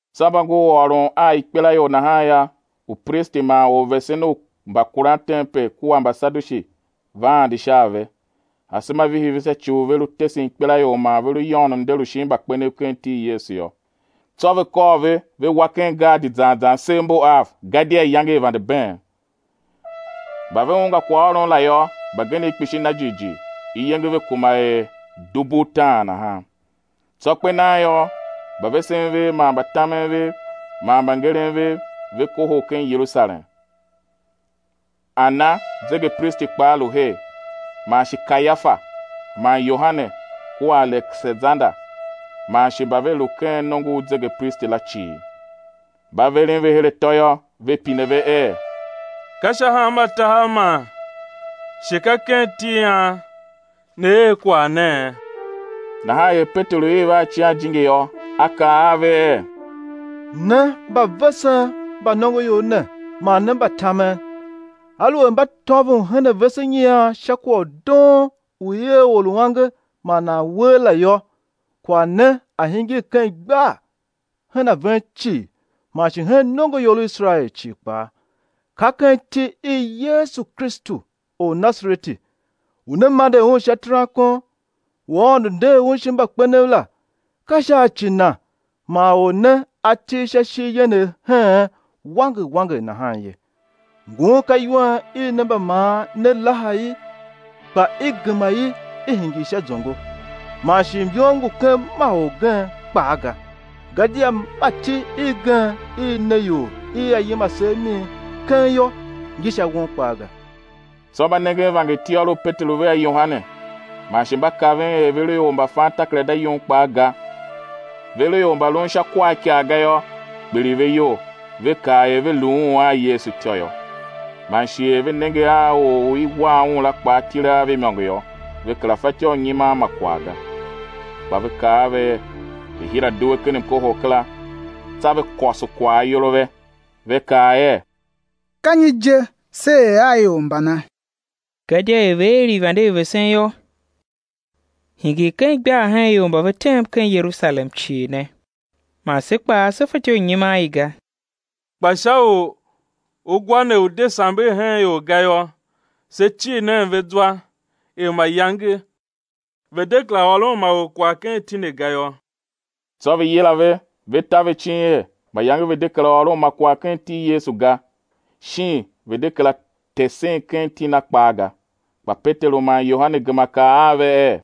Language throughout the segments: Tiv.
Tsô mba ngur ôron a ikpelaior nahan yô, upristi man orvesen u mbakurantempel kua Mbasadushi va ande sha a ve. Asema vihi ve sha ci u ve lu tesen ikpelaior man ve lu yôôn mnder u shin mbakpenev ken iti i Yesu yô. Tsô ve kôr ve, ve wa ken gaadi zan zan sev mbu av gadia iyange i vande been. Mba ve ungwa kwaghôron la yô, mbagenev kpishi na jighjigh, iyenge ve kuma er dubu utaan nahan. Tsô kper nan yô, mbavesen vev man mbatamen vev man mbangeren vev ve kohol ken Yerusalem; Ana, zegepristi kpaa lu her, man shi Kayafa man Yohane kua Alekesander man shi mba ve lu ken nongo u zegepristi la cii. Mba veren ve her atô yô, ve pine ve er: Ka sha hanma tahav man shi ka ken iti i an ne er kwagh nee? Nahan er Peteru iv a Icighan Jijingi yô, a kaa a ve er: Ne mbavesen mba nongoior ne man ne mbatamen, aluer mba tôvon hen vese nyian sha kwagh u doon u i er oruange man nan wer la yô, kwagh ne a̱ hingir ken igbar her a ven cii man shi hen nongoior u Iserael cii kpaa, ka ken iti i Yesu Kristu Ornasareti, u ne mande Un sha terankon, u Aôndo nder Un shin mbakpenev la, ka sha ci Na man or ne a til sha ishigh yenegh heen wanger wanger nahan ye. Ngun ka iwen i ne mbamaan ne laha i, kpa i gema i, i hingir sha zongo yô. Man shi myom ngu ken ma or ugen kpaa ga; gadia ma iti igen i i ne ior i á yima se a mi keng yô, ngi sha won kpaa ga. Tsô mba nengen vangertiôr u Peteru vea Yohane, man shi mba kaven er ve lu ior mba fan takerada yum kpaa ga, ve lu ior mba lun sha kwarikaa ga yô, kpiligh ve iyol, ve kav er ve luun a Yesu ityô, yô. Man shi er ve nenge a or u i war un la kpaa tile a ve imôngo yô, ve kera fatyô u nyiman ma kwagh ga. Kpa ve kaa a ve er, ve̱ hira due ken mkohol kera, tsô ve kôso kwagh ayol a ve, ve kaa er: Ka nyi je sé er a ior mbana? Gadia er ve er ivande i vesen yô, hingir ken igbar hen ior mba ve tem ken Yerusalem cii ne; man se kpaa se fatyô u nyiman i ga. Kpa sha u ugwa ne u̱ de samber hen ior ga yô, se cir nen ve zwa er mayange ve̱ de kera ôron ma or kwagh ken iti ne ga yô. Tsô ve yila ve, ve ta ve icin er, mayange ve̱ de kera ôron ma kwagh ken iti i Yesu ga shin ve̱ de kera tesen kwagh ken iti Na kpaa ga. Kpa Peteru man Yohane gema kaa a ve er: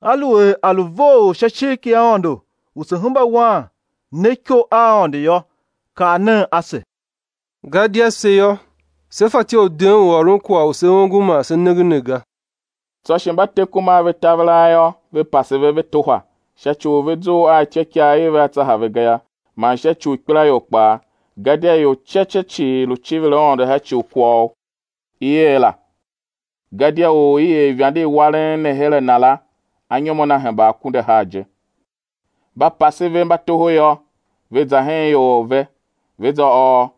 Aluer a lu vough sha ishigh ki Aôndo u sé hemba wan ne iko a Aôndo yô, kaa nen ase! Gadia se yô, se fatyô u den u ôron kwagh u se ongo man se nenge ne ga. Tsô shi mba te kume a ve taveraa yô, ve pase ve, ve tuhwa, sha ci u ve zua a ityôikaa i vea tsaha ve ga yô, man shi sha ci u ikpelaior kpaa, gadia ior ca ca cii lu civir Aôndo sha ci u kwagh u i er la. Gadia or u i er ivande i waren ne her a na la, anyom a na hemba akunduahar je. Mba pase ve mba toho yô, ve za hen ior, ve za ôr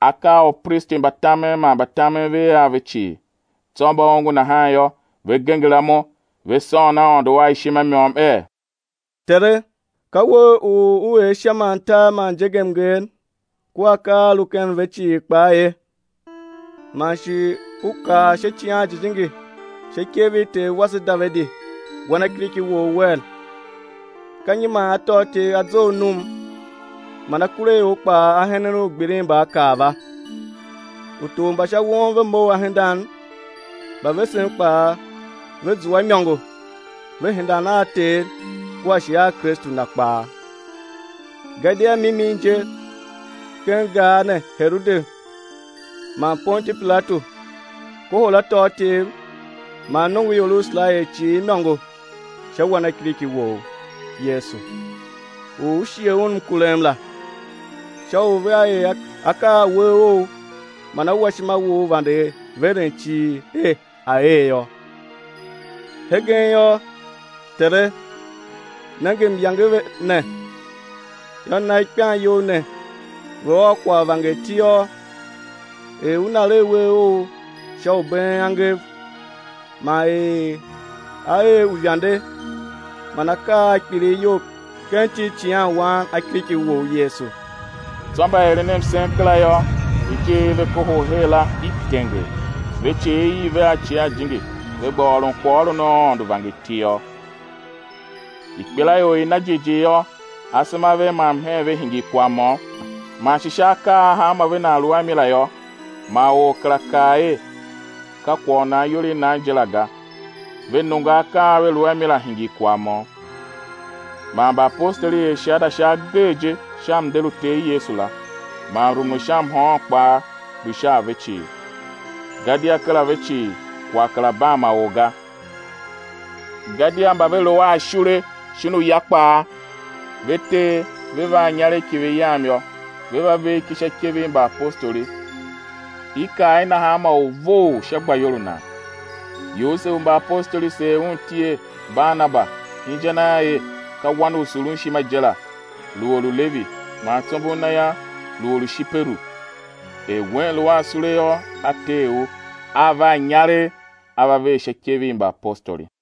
akaa a upristi mba tamen man mbatamen ve er a ve cii. Tsô mba ongo nahan yô, ve genger imo ve sôn Aôndo a ishima i môm er: Tere, ka We u U er Sha man tar man zegemnger kua akaa a a lu ken ve cii kpaa ye. Man shi U kaa sha Icighan Jijingi sha ikev i ter wase Davidi, wanakiriki Wou Wer: Ka nyi man atôatyev a zough num, man akuraior kpaa a henen ugbilinmbaakaava? Utor mba sha won ve mough ahendan, mbavesen kpaa ve zua imôngo, ve hendan a Ter kua shi a Kristu Na kpaa. Gadia mimi je, ken gar ne Herode man Pontiu Pilatu kohol a atôatyev man nongoior u Iserael cii imôngo sha Wanakiriki Wou, Yesu, u U shighe Un mkurem la, sha u vea er akaa a uwegh Ough man awashima Wou vande veren cii er á er yô. Hegen yô, Tere, nenge myange ve ne, yô, na ikpan You ne ve̱ ôr kwagh vangertiôr, er U naregh uwegh Ough sha u been angev, man er á er uivande man akaa a kpilighyol ken iti i Icighan Wanakiriki Wou, Yesu. Tsô mba eren msen kera yô, ijiir i ve kohol her la, i tenger, ve cii i iv ve a Icighan Jijingi, ve gba ôron kwaghôron u Aôndo vangertiôr. Ikpelaior i i na jighjigh yô, asema a ve man mhen ve hingir kwagh môm, man shi sha akaa a hanmô ve nan lu a mi la yô, ma or kera kaa er, ka kwagh u nan iyol i nan je la ga, ve nungwa akaa a ve lu a mi la hingir kwagh môm. Man mbaapostoli er shiada sha agee je sha mnder u Ter Yesu la, man m mrumun u sha mhôôn kpaa lu sha a ve cii. Gadia ker a ve cii kwagh kera ban ma or ga; gadia mba ve lu a ishule shin uya kpaa, ve tee, ve va a inyaregh ki ve yam yô, ve va ver ki sha ikev i mbaapostoli; i kar i na hanma or vough sha gbayol u nan. Yosev, u mbaapostoli seer un iti er Barnaba (inja na yô, er, ka wan u surun ishima je la), lu or u Levi, man tsombor na yô, lu or u Shiperu, er wen lu a sule yô, a tee u, a va a inyaregh, a va ver sha ikev i mbaapostoli.